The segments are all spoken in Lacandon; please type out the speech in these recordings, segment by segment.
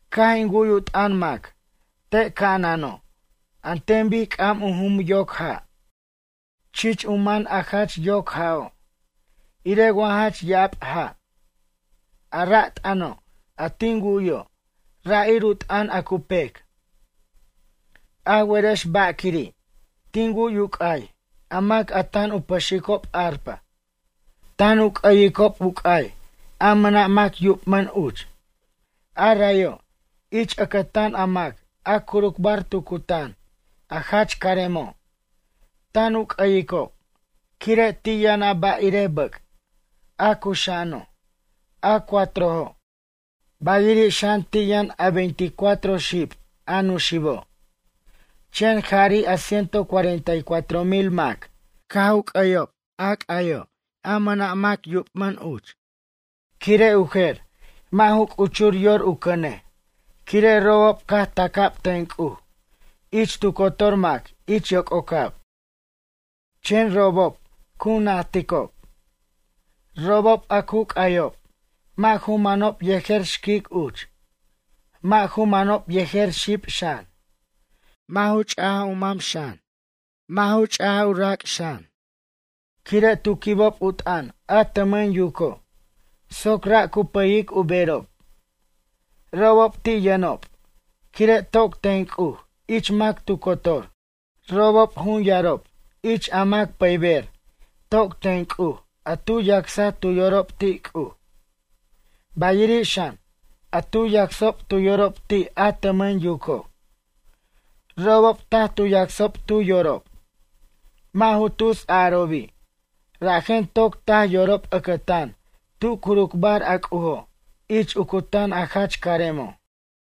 Caj in wu'y u t'ʌn mac te' ca'anano' an ten bic c'am u jum u yoc ja', chich u man a jach yoc ja'o', irej wa jach ya'ab ja'. A ra' t'ʌno' a tin wu'yo', ra' ir u t'ʌn a cu pec. A werex ba' quiri', tin wu'y u c'ay a mac a tan u pʌxicob arpa. Tan u c'ʌyicob u c'ay a mʌna' mac yubmʌn uch. A rayo', ich ʌcʌtan a mac a curucbar tu cutan a jach caremo', tan u c'ʌyicob quire' ti' yʌn a ba' irej bʌc', a cuxa'ano', a cuatrojo', bayiri' xan ti' yʌn a veinte y cuatro xib, a nuxibo'. Chen jari' a ciento cuarenta y cuatro mil mac caj u c'ayob a c'ayo' a mʌna' mac yubmʌn uch. Quire' u jer mʌ' ju c'uchur yor u cʌnej quire' robob caj taca'b ten C'uj ich tu cotor mac ich yoc'ocab. Chen robob cu najticob. Robob a cu c'ayob, mʌ' ju manob yejer xquic uch, mʌ' ju manob yejer xib xan, mʌ' ju ch'aj u mam xan, mʌ' ju ch' u rac' xan, quire' tu quibob u t'ʌn a tʌmʌn yuco', soc ra' cu pʌyic u berob. Robob ti' yʌnob, quire' toc ten C'uj ich mac tu cotor. Robob jun yarob ich a mac pʌyber toc ten C'uj a tu yacsaj tu yorob ti' C'uj, bayiri' xan, a tu yacsob tu yorob ti' a tʌmʌn yuco'. Robob taj tu yacsob tu yorob, mʌ' ju tus a'arobi', rajen toc taj yorob ʌcʌtan tu curucbar a C'ujo' ich u cutan a jach caremo'.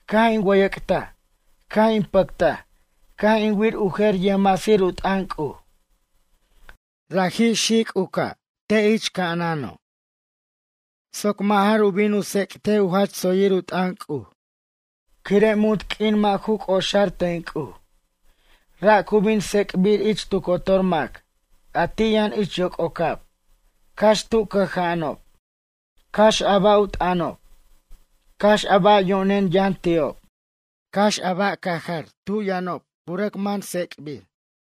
Caj in wʌyʌc'taj caj in pʌctaj caj in wir u jer yʌjmasir u t'ʌn C'uj. Raji' xic' u ca' te' ich ca'anano', soc mʌ' jar u bin u tsec't u jach tsoyir u t'ʌn C'uj, quire' munt q'uin mʌ' ju c'oxar ten C'uj. Ra' cu bin tsec'bir ich tu cotor mac a ti' yʌn ich yoc'ocab, cax tu cʌja'anob, cax a ba' u t'ʌnob, cax a ba' yo'nen yʌn ti'ob, cax a ba' cajar tu yʌnob cu rʌc man tsec'bir.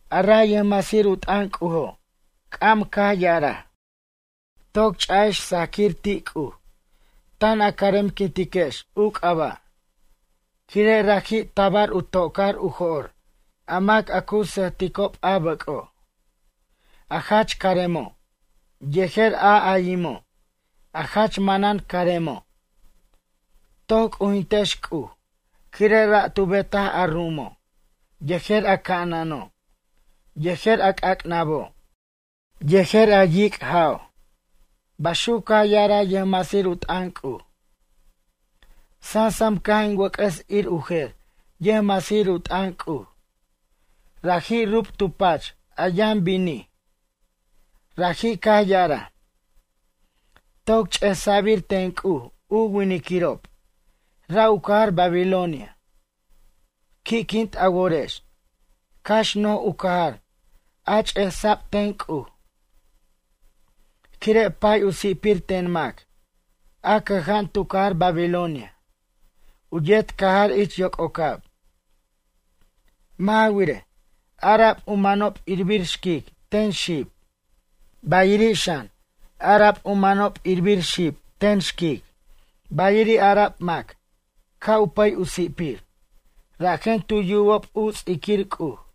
A ray yʌjmasir u t'ʌn C'ujo' c'am caj ya'araj: ―Toc ch'a'ex sajquir ti' C'uj tan a caremquintiquex u c'aba', quire' raji' tabar u to'car u jo'r a mac a cu sʌjticob a bʌc'o', a jach caremo' yejer a ayimo' a jach manan caremo'. Toc c'ujintex C'uj, quire' ra' tu betaj a ru'umo', yejer a ca'anano' yejer a c'ac'nabo' yejer a yic' ja'o' ―baxuc caj ya'araj yʌjmasir u t'ʌn C'uj. Sansam caj in wʌc'ʌs ir u jer yʌjmasir u t'ʌn C'uj, raji' rub tu pach a yʌn binij. Raji' caj ya'araj: ―Toc ch'esa'bir ten C'uj u winiquirob, ra' u cajar Babilonia. Qui'quint a worex, cax no'j u cajar a ch'esa'b ten C'uj, quire' pay u si'pir ten mac a cʌja'an tu cajar Babilonia u yet cajar ich yoc'ocab. Mʌ' ja wirej, ara'b u manob irbir xquic ten xib, bayiri' xan, ara'b u manob irbir xib ten xquic, bayiri' ara'b mac ca' u pʌy u si'pir, rajen tu yubob u ts'iquir C'uj.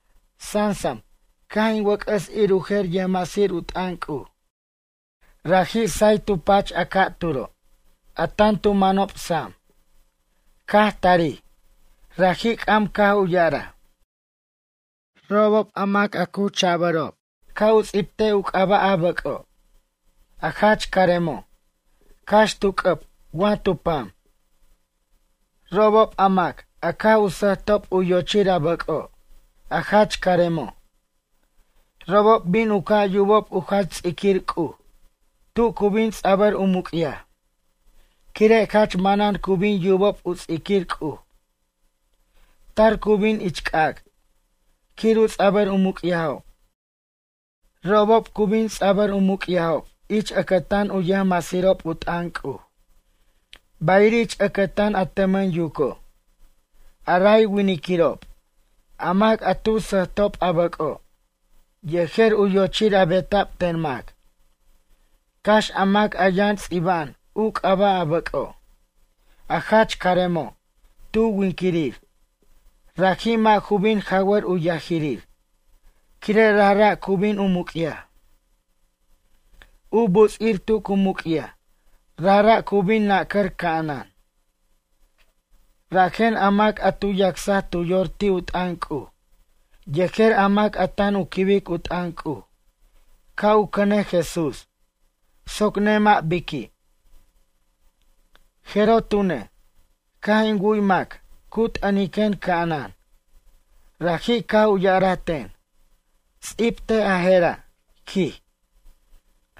Sansam caj in wʌc'ʌs ir u jer yʌjmasir u t'ʌn C'uj, raji' say tu pach a ca'turo', a tan tu manob sam. Caj tarij, raji' c'am caj u ya'araj: ―Robob, a mac a cu cha'bʌrob ca' u ts'ibt u c'aba' a bʌc'o', a jach caremo', cax tu c'ʌb wa tu pam. Robob a mac a caj u sʌjtob u yochir a bʌc'o', a jach caremo'. Robob bin u ca' yubob u jach ts'iquir C'uj tu cu bin ts'abʌr u muc'yaj, quire' jach manan cu bin yubob u ts'iquir C'uj. Tar cu bin ich c'ac' quir u ts'abʌr u muc'yajob. Robob cu bin ts'abʌr u muc'yajob ich ʌcʌtan u yʌjmasirob u t'ʌn C'uj, bayiri' ich ʌcʌtan a tʌmʌn yuco'. A ray winiquirob, a mac a tu sʌjtob a bʌc'o', yejer u yochir a beta'b ten mac, cax a mac a yʌn ts'iba'an u c'aba' a bʌc'o', a jach caremo' tu winquirir, raji' mʌ' ju bin jawʌr u yajirir, quire' rajra' cu bin u muc'yaj. U buts'ir tu cu muc'yaj rajra' cu bin u nacʌr ca'anan. Rajen a mac a tu yacsaj tu yor ti' u t'ʌn C'uj yejer a mac a tan u quibic u t'ʌn C'uj ca' u cʌnej Jesús soc nemʌ' biqui'. Jeroj tune', caj in wu'y mac cu t'ʌniquen ca'anan. Raji' caj u ya'araj ten: ―Ts'ibtej a je'ra', quij: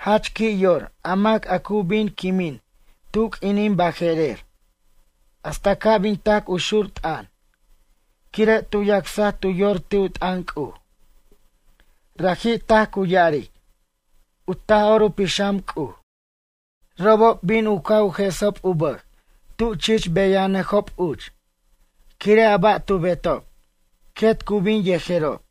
“Jach qui' yor a mac a cu bin quimin tu q'uinin baje'rer hasta ca' bin tac u xur t'ʌn quire' tu yacsaj tu yor ti' u t'ʌn C'uj.” Raji' taj cu ya'aric u Taj'or u Pixam C'uj. Robob bin u ca' u jesob u bʌj tu chich beyajnʌjob uch, quire' a ba' tu betob, quet cu bin yejerob.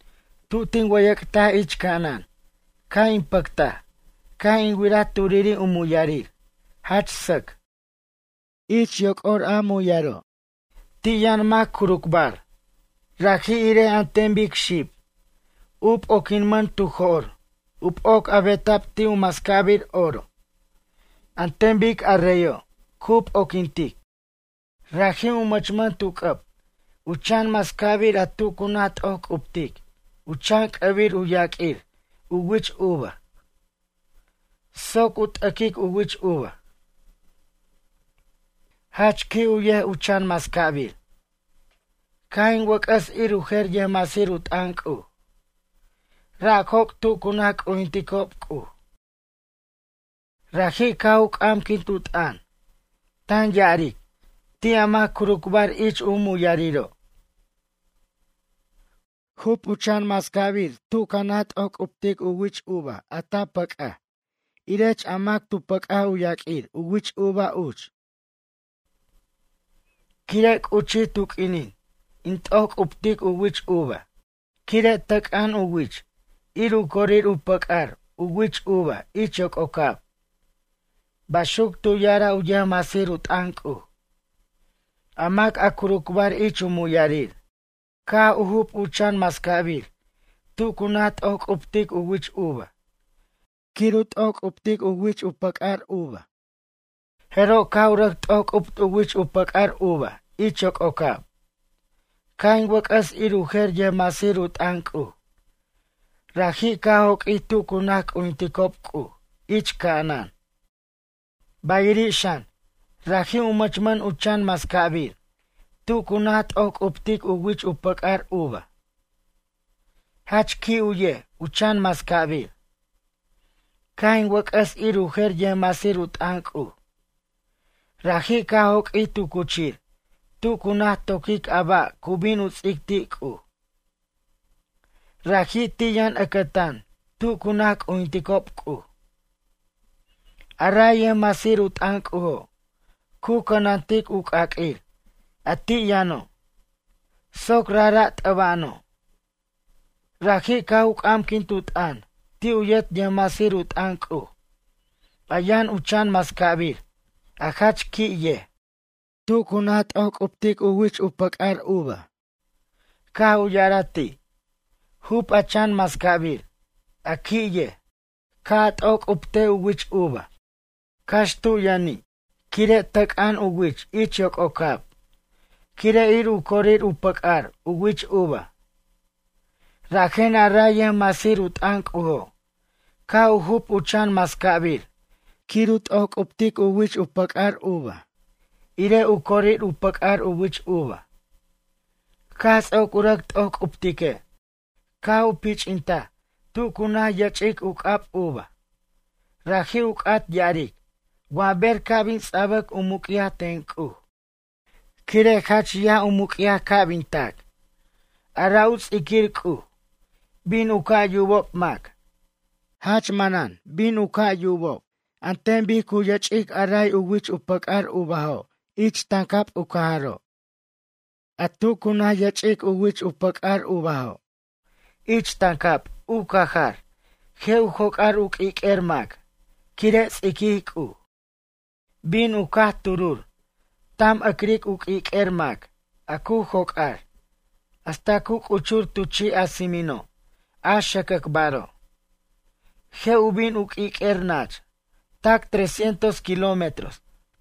Tu tin wʌyʌc'taj ich ca'anan caj in pʌctaj caj in wiraj turiri' u muyarir, jach sʌc. Ich yoc'ar u muyaro', ti' yʌn mac curucbar, raji' irej an ten bic xib, u p'oquinmʌn tu jo'r u p'oc a beta'b ti' u mascabir oro, an ten bic a reyo' cu p'oquintic. Raji' u mʌchmʌn tu c'ʌb u chan mascabir a tu cu naj t'oj c'uptic u chan c'ʌbir u yaq'uir u wich uva, soc u t'aquic u wich uva. Jach qui' u yej u chan mascabir. Caj in wʌc'ʌs ir u jer yʌjmasir u t'ʌn C'uj. Ra' joc' tu cu naj c'ujinticob C'uj. Raji' caj u c'amquint u t'ʌn, tan ya'aric ti' a mac curucbar ich u muyariro': ―Jup u chan mascabir tu ca naj t'ojc'uptic u wich uva a ta pʌc'aj irech a mac tu pʌc'aj u yaq'uir u wich uva uch. Quire' c'uchij tu q'uinin in t'ojc'uptic u wich uva quire' tʌc'an u wich ir u corir u pʌc'ar u wich uva ich yoc'ocab ―baxuc tu ya'araj u yʌjmasir u t'ʌn C'uj. A mac a curucbar ich u muyarir caj u jup u chan mascabir tu cu naj t'ojc'uptic u wich uva quir u t'ojc'uptic u pʌc'ar u wich uva, jeroj caj u rʌc t'ojc'upt u pʌc'aj u wich uva ich yoc'ocab. Caj in wʌc'ʌs ir u jer yʌjmasir u t'ʌn C'uj. Raji' caj joq'uij tu cu naj c'ujinticob C'uj ich ca'anan. Bayiri' xan, raji' u mʌchmʌn u chan mascabir tu cu naj t'ojc'uptic u wich u pʌc'ar uva. Jach qui' u yej u chan mascabir. Caj in wʌc'ʌs ir u jer yʌjmasir u t'ʌn C'uj. Raji' caj joq'uij tu cuchir tu cu naj toquic a ba' cu bin u ts'ic ti' C'uj. Raji' ti' yʌn ʌcʌtan tu cu naj c'ujinticob C'uj. A ray yʌjmasir u t'ʌn C'ujo', cu cʌnantic u c'aq'uir a ti' yʌno', soc rajra' t'ʌba'ano'. Raji' caj u c'amquint u t'ʌn ti' u yet yʌjmasir u t'ʌn C'uj a yʌn u chan mascabir a jach qui' yej quir u naj t'ojc'uptic u pʌc'ar u wich uva. Caj u ya'araj ti': ―Jup a chan mascabir, a qui' yej, ca' a t'ojc'uptej u wich uva, cax tu yʌni' quire' tʌc'an u wich ich yoc'ocab, quire' ir u corir u pʌc'ar u wich uva. Rajen a ray yʌjmasir u t'ʌn C'ujo', caj u jup u chan mascabir quir u t'ojc'uptic u pʌc'ar u wich uva irej u corir u pʌc'ar u wich uva. Caj ts'oc u rʌc t'ojc'uptique', caj u pich'intaj tu cu naj yʌch'ic u c'ab uva. Raji' u c'at ya'aric wa ber ca' bin ts'abʌc u muc'yaj ten C'uj quire' jach yaj u muc'yaj ca' bin tac. A ra' u ts'iquir C'uj bin u ca' yubob mac, jach manan bin u ca' yubob an ten bic cu yʌch'ic a ray u pʌc'ar u wich uvajo' ich tancab u cajaro'. A tu cu naj yʌch'ic u pʌc'ar u wich uvajo' ich tancab u cajar je' u joc'ar u q'uiq'uer mac quire' ts'iquij C'uj. Bin u caj turur, tam ʌcriquic u q'uiq'uer mac a cu joc'ar, hasta cu c'uchur tu chi' a tsimino' a xʌcʌcbaro'. Je' u bin u q'uiq'uer nach tac tresciento kilómetros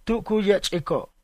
tu cu yʌch'ico'.